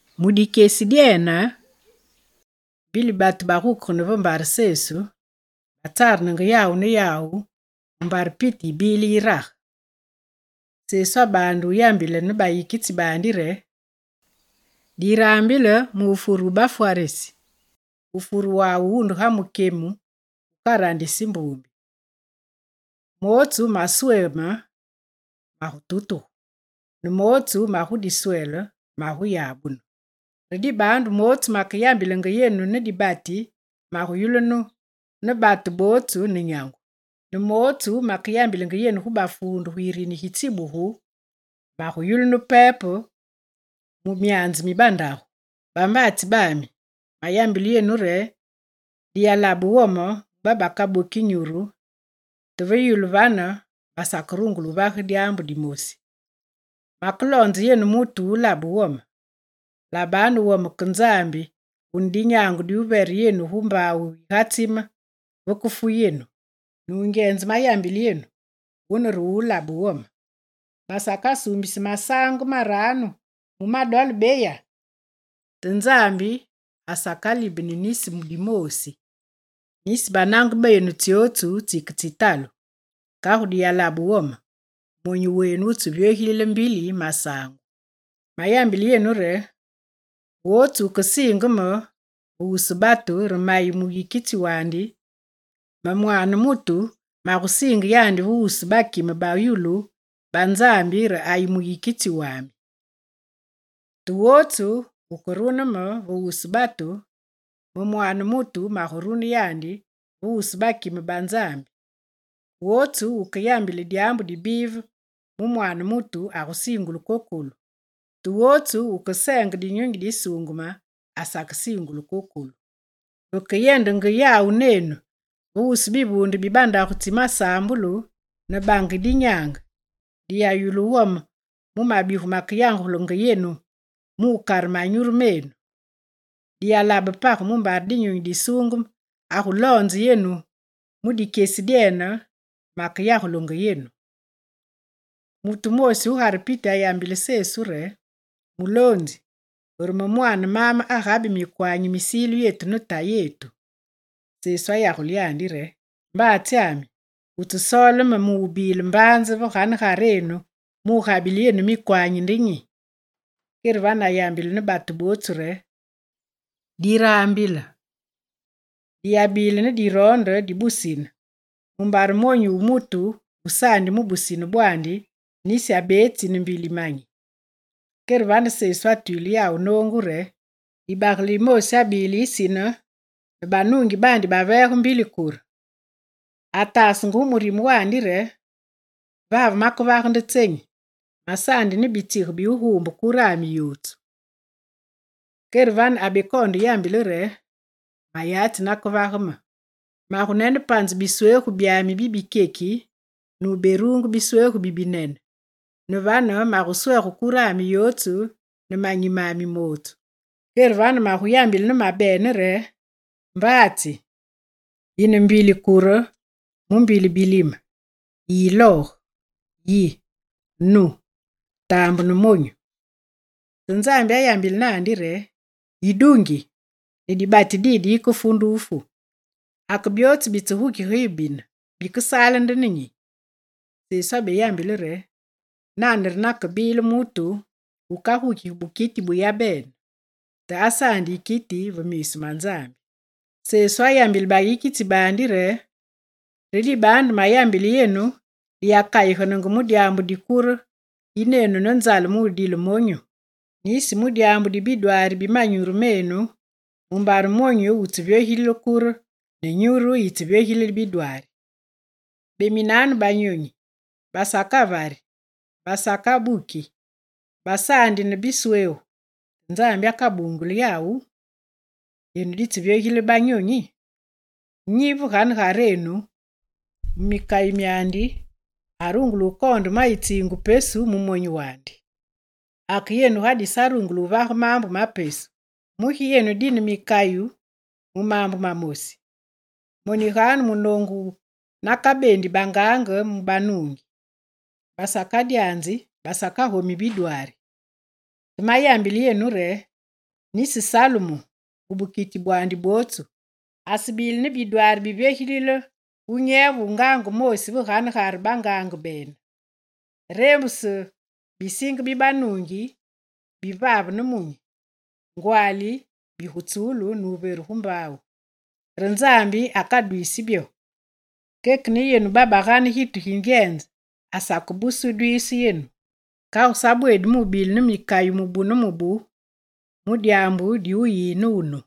Mu dikyesi dyene, mbili batu bagukegene ve mbare Sesu, batsarenenge yawu ne yawu mumbare piti yibile yirage. Sesu abaande wuyambile ne bayikitsi baandi re: «Raambilanu mu wufure wu bafwarisi. Wufure wawu wunde ga mukyemu wukarandisi mbumbi. Mootsu masweme magututugu, ne mootsu magudiswele maguyabunu. Re dibaandu, mootsu makeyambilenge yenu ne dibati maguyulunu ne batu bootsu ne nyangu, ne mootsu makeyambilenge yenu gu bafuundu gu yirini gi tsibugu, maguyambulu pepe mu myaanze mi bandagu. Bambaatsi bami, mayambile yenu re: diyalabe wome gu babakaboki nyuru, te ve yulu vane baseberungule wuvage dyaambu dimosi. Makeloonze yenu mutu wu wulabe wome: labanu wome ke Nzambi wune dinyaange diwuvere yenu gu mbaawu yigatsime vekefu yenu. Nungyenze mayambile yenu, wune re wu wulabe wome. Basakasuumbisi masaangu maranu mu ma dole beya? Te Nzambi asakalibeni nisi dimoosi. Nisi banange benu tsyotsu tsiketsitalu. Kagu diyalabe wome: monyu wenu wutsevyogilile mbili masaangu. Mayambile yenu re: wotsu wukesiinge me ve wusu batu re mayi muyikitsi wandi, me Mwaane mutu magusiinge yandi ve wusu bakime ba yulu ba Nzambi re ayi muyikitsi wami. Te wotsu wukerune me ve wusu batu, me Mwaane mutu magurune yandi ve wusu bakime ba Nzambi. Wotsu wukeyambile dyaambu dibive mu Mwaane mutu, agusiingulu kokolu, te wotsu wukeseenge Dinyunyi Disuungeme asakesiingulu kokolu. Vekeyendenge yawu nenu ve wusu bivuunde bibandagu tsi masaambulu, ne bange dinyaange, diyayulu wome mu mabigu makeyagulenge yenu mukare manyuru menu. Diyalabe page mumbare Dinyunyi Disuungeme aguloonzenge yenu mu dikyesi dyene makeyagulenge yenu.» Mutu wumoosi gugare piti ayambile Sesu re: «Muloonzi, rume mwaane maame agabi mikwanyi misilu yetu ne tayetu.» Sesu ayagule yandi re: «Mbaatsyami, wutsesoole me mubile mbaanze ve ganegarenu, mugabile yenu mikwanyi nde nyi?» Kere vane ayambile ne bootsu re: «Raambilanu! Diyabile ne diroonde dibusine, mumbare monyu wu mutu wusaandi mu busine bwandi, nisi abetsi ne mbili manyi.» Kere vane Sesu atwile yawu noongu re: «Dibagele dimoosi abile yisine, ne banuungi baandi baveege mbili kure. Ataasenge gu murime wandi re: “Vave makevage nde tsenyi? Masaandi ne bitsige bi wuguumbe kurami yotsu.” Kere vane abekoonde re: “Mayatsi nakevage me: magunene panze biswegu byami bibikyeki, nuberuunge biswegu bibinene, ne vane maguswege kurami yotsu ne manyi mami mamosi. Kere vane, maguyambile ne mabene re: Mbaatsi! Yine mbili kure mu mbili bilime, yiyilooge, yi, nu, taambe ne monyu.” Te Nzambi ayambile naandi re: “Yidungi! Ne dibati didi yikefu nde wufu. Ake byootsu bitsegukige yu bine, bikesaale nde ne nyi?”» Sesu abeyambile re: «Nane re nakebile mutu wukagukigi bukiti bu yabene, te asaandi yikiti ve miisu ma Nzambi.» Sesu ayambile bayikitsi baandi re: «Re dibaandu mayambile yenu, diyakayigene mu dyaambu di kure yinenu ne nzale mudile monyu, nisi mu dyaambu di bidwaari bi manyuru menu, mumbare monyu wutsevyogilile kure, ne nyuru yitsevyogilile bidwaari. Beminanu banyonyi: basakavari, basakabuki, basaandi ne biswegu, te Nzambi akabunguli yawu! Yenu ditsevyogilile banyonyi! Nyi ve ganegarenu mu mikayu myandi arungule wukoonde ma yitsiingu pesu mu monyu wandi? Ake yenu ga disarungule wuvage maambu ma pesu, mugi yenu dine mikayu mu maambu mamosi? Moniganu munoongu nakabeendi bangaange mu banuungi: basakadyanzi, basakagomi bidwaari. Te mayambile yenu re: nisi Salumu, mu bukiti bwandi bwotsu, asebile ne bidwaari bivyogilile wunyeve wu ngaange moosi ve ganegare bangaange bene. Reembuse bisinge bibanuungi bivave nemunyi, ngwaali bigutsulu nuveru gu mbaawu, re Nzambi akadwiisi byo; keke ne yenu batu babagane gitu gi ngyenze asakebuse wudwiise yenu. Kagu sa bweedi mubile ne mikayu mubu ne mubu mu dyaambu di wuyi ne wunu.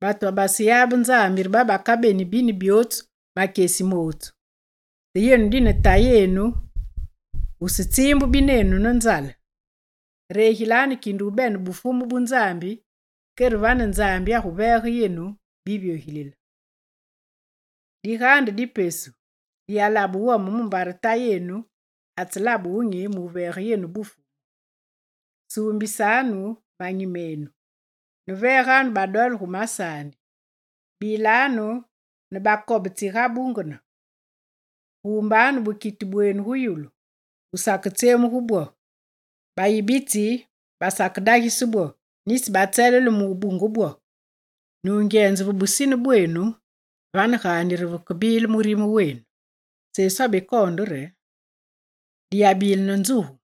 Batu babaseyabe Nzambi re babakabeni bine byootsu makyesi mootsu. Te yenu, dine Tayenu wusetsiimbu binenu ne nzale. Regilanu kinde wubene Bufumu bu Nzambi, kere vane Nzambi aguveege yenu bivyogilile. Digaande di pesu, diyalabe wome, mumbare Tayenu atselabe wunyi muveege yenu Bufumu. Suumbisanu manyi menu, ne veeganu badole gu masaandi. Bilanu ne bakobe tsigabungene, guumbanu bukiti bwenu gu yulu, gu saketsyemugu bwo: bayibitsi basakedagise bwo, nisi batselele mubunge bwo. Nungyenze, ve busine bwenu, vane gaandi re vekebile murime wenu.» Sesu abekoonde re: «Diyabile ne nzugu,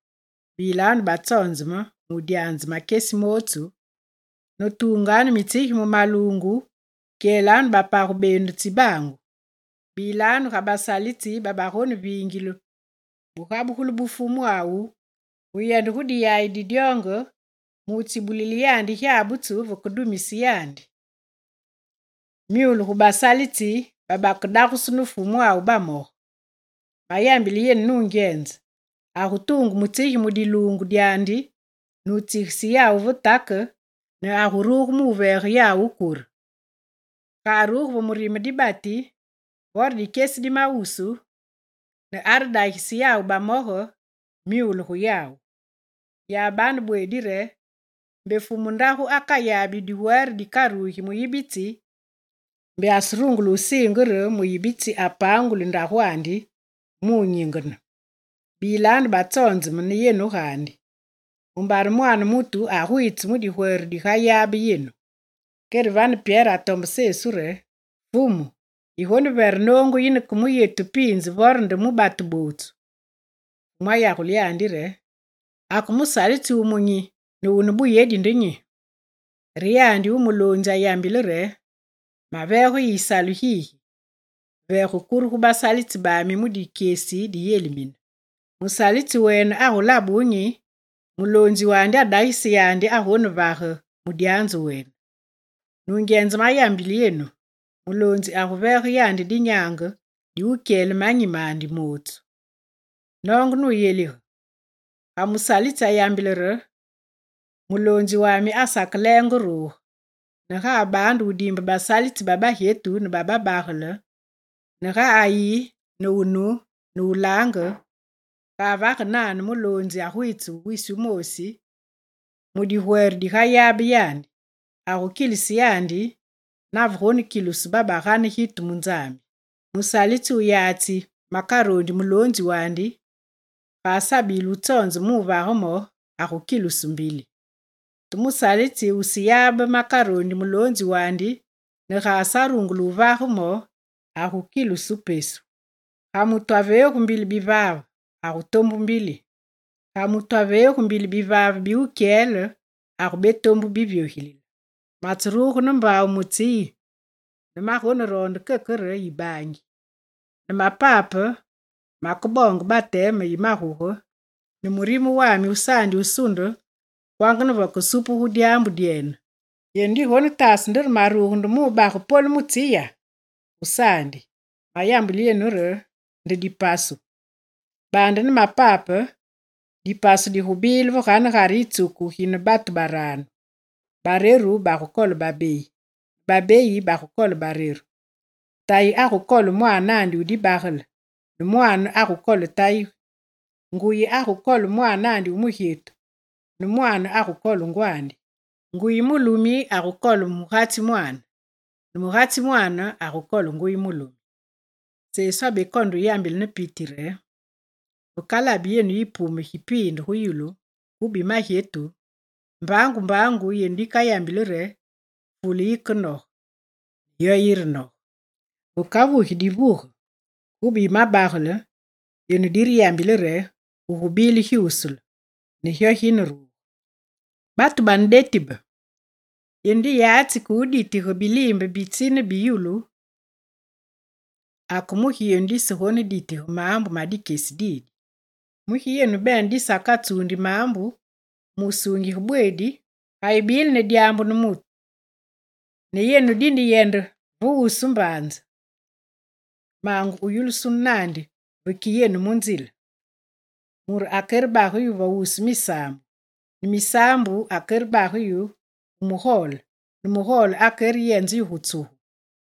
bilanu batsonzeme mudyanze makyesi mootsu ne tuunganu mitsigi mu maluungu, kyelanu bapage benu tsibaangu. Bilanu ga basalitsi babagoneviingile bugabugulu bu fumwawu wuyende gu diyayi di dyoonge, mutsibulile yandi gyabutsu vekedumise yandi. Myule gu basalitsi, babakedagusu ne Fumwawu bamoge! Mayambile yenu nungyenze: agutuunge mutsigi mu diluungu dyandi, nutsigise yawu ve take ne aguruge muveege yawu kure. Ga aruge ve murime dibati, vore ve dikyesi dimawusu, ne aredagise yawu bamoge, myule gu yawu! Yabanu bweedi re: mbe fumu ndagu akayabi digwere dikarugi muyibitsi, mbe aserungule wusiinge re muyibitsi apanguli ndagwandi mu wunyingene. Bilanu batsonzeme ne yenu gaandi, mumbare Mwaane mutu agwiitse mu digwere digayabe yenu.» Kere vane Pyere atombe Sesu re: «Fumu, yigonevere noongu yine ke mu yetu piinze vore nde mu batu bootsu?» Fumu ayagule yandi re: «Ake musalitsi wumunyi ne wune buyedi nde nyi? Re yandi wu muloonzi ayambile re: “Maveege yu yisalu gigi; veege kure gu basalitsi bami mu dikyesi diyelimine.” Musalitsi wene agulabe wunyi ga muloonzi wandi adagise yandi agonevage mudyanzu wene. Nungyenze mayambile yenu, muloonzi aguveege yandi dinyaange diwukyele manyi mandi mootsu. Noonge nuyelige: ga musalitsi ayambile re: “Muloonzi wami asakelenge wuruge”, ne ga abaande wudiimbe basalitsi babagyetu ne babagele, ne ga ayi ne wunu, ne wulaange, ga avage nane, muloonzi agwiitse wisi wumoosi, mu digwere digayabe yandi; agukilise yandi navegonekilusu babagane gitu mu Nzambi. Musalitsi wuyatsi makaroondi muloonzi wandi, ga asabile wutsonzeme ne wuvage mo, agukilusu mbili. Te musalitsi wuseyabe makaroondi muloonzi wandi ne ga asarungule wuvage mo, agukilusu pesu. Ga mutu aveegu mbili bivaave, agutombu mbili. Ga mutu aveegu mbili bivaave bi wukyele agubetombu bivyogilile. Matseruge ne mbaawu mu tsi yi ne magoneroonde keke re yibaangu! Ne mapape makeboonge bateme yi maguge ne murime wami wusaandi wusunde kwanga ne vekesupugu dyaambu dyene! Yenu digonetaase nde re maruge nde mubage polu mu tsi ya? Gusaandi, mayambile yenu re nde dipasu. Baande ne mapape dipasu digubile va ganegare yitsuku gine batu baranu. Bareru bagukole babeyi, ne babeyi bagukole bareru. Tayi agukole mwaanandi wu dibagele, ne mwaane agukole tayi, nguyi agukole mwaanandi wu mugyetu, ne mwaane agukole ngwandi, nguyi mulumi agukole mugatsi mwaane, ne mugatsi mwaane agukole nguyi mulumi.» Sesu abekoonde yambile ne piti re: «Vekalabi yenu yipume gipiinde gu yulu kube yimagyetu, mbaangu mbaangu yenu dikayambili re: “Fule yikenoge”, ne yo nunoge. Vekavugi divuge kube yi mabagele, yenu direyambile re: “Gugubile gyusule”, ne gyo gineruge. Batu bane deti be! Yenu diyatsi ke wuditige biliimbe bi tsi ne bi yulu, ake mugi yenu disegoneditige maambu ma dikyesi didi? Mugi yenu bene disakatsuundi maambu, mu wusuungige bweedi? Ga yibile ne dyaambu ne mutu, ne yenu dineyende ve wusu mbaanze, maange wuyulusunu naandi veki yenu mu nzile. Mure akerebage yu ve wusu misaambu, ne misaambu akerebage yu gu mugole, ne mugole akereyenze yu gu tsugu.